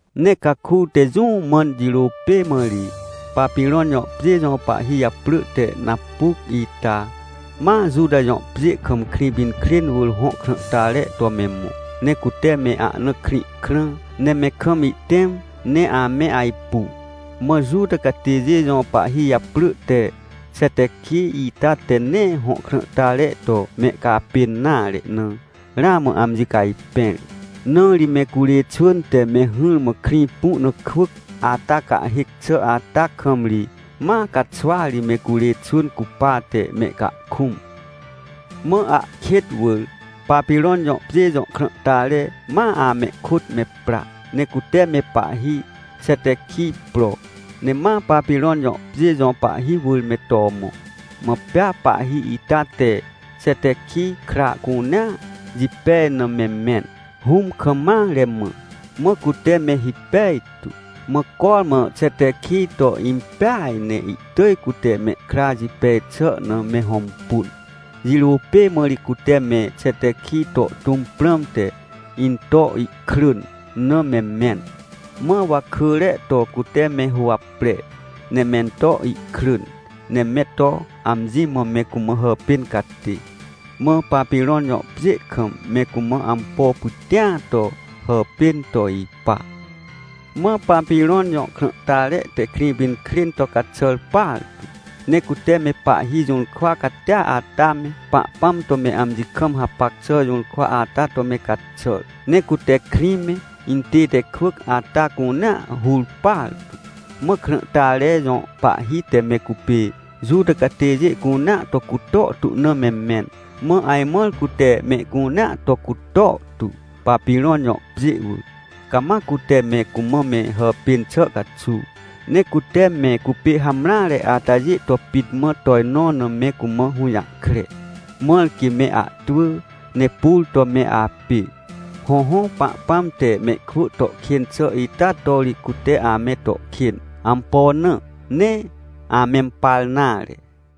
Ne caku te jũ mãn jirô pê mã ri, Papirõn jõ pjê jõ pahhi japrỳ te Napuc ita, ma Juta jõ pjê kam Krĩpinkrên wỳr hõ krãhtare to me mõ. Ne cute me ahna krĩ krã, ne me kam ihtẽm ne ame ajpu. Mã Juta catêjê jõ pahhi japrỳ te Xetequij ita te nee hõ krãhtare to mehcapên nare na, ramã amji cajpẽr. Na ri me curê xwỳn te me hỹrmã krĩ pu na kwỳc ata cahhêc xà ata kam ri ma caxwa ri me curê xwỳn cupate mehcahkũm. Mã ahkêt wỳr, Papirõn jõ pjê jõ krãhtare ma amehkôt me pra, ne cute me pahhi Xetequij pro, ne ma Papirõn jõ pjê jõ pahhi wỳr me to mõ. Mã pea pahhi ita te Xetequij kra cunea jipej na me mẽn, hũm kam mare mã. Mã cute me hipej tu, mã cormã Xetequij to impeaj ne ihtỳj cute mehkra jipej xà na me hõmpun. Jirô pê mã ri cute me Xetequij to tũm prãmte, into krỳn na me mẽn. Mã wakỳre to cute me huwapre, ne mento krỳn, ne me to amji mã me cumã hàpên catê, mã Papirõn jõ pjê kam me cumã ampo pytĩa to hàpên to ipa. Mã Papirõn jõ krãhtare te Krĩpinkrên to caxàr partu. Ne cute me pahhi jũrkwa catia ata me, Pahpãm to me amji kam hapac xà jũrkwa ata to me caxàr. Ne cute krĩ me, intête kwỳc ata cunea hur partu. Mã krãhtare jõ pahhi te me cupê Juta catêjê cunea to cutor tu na me mẽn. Mã ajmãr cute mehcunea to cutor tu, Papirõn jõ pjê wỳr, cama cute me cumã me hàpên xà caxuw. Ne cute me cupê hamreare atajê to pit mã tojnõ na me cumã hũjahkre, mãr quê me ahtwỳ ne pur to me apê. Hõhõ, Pahpãm te mehkwỳ to kên xà ita to ri cute ame to kên. Ampo na? Nee amempar nare.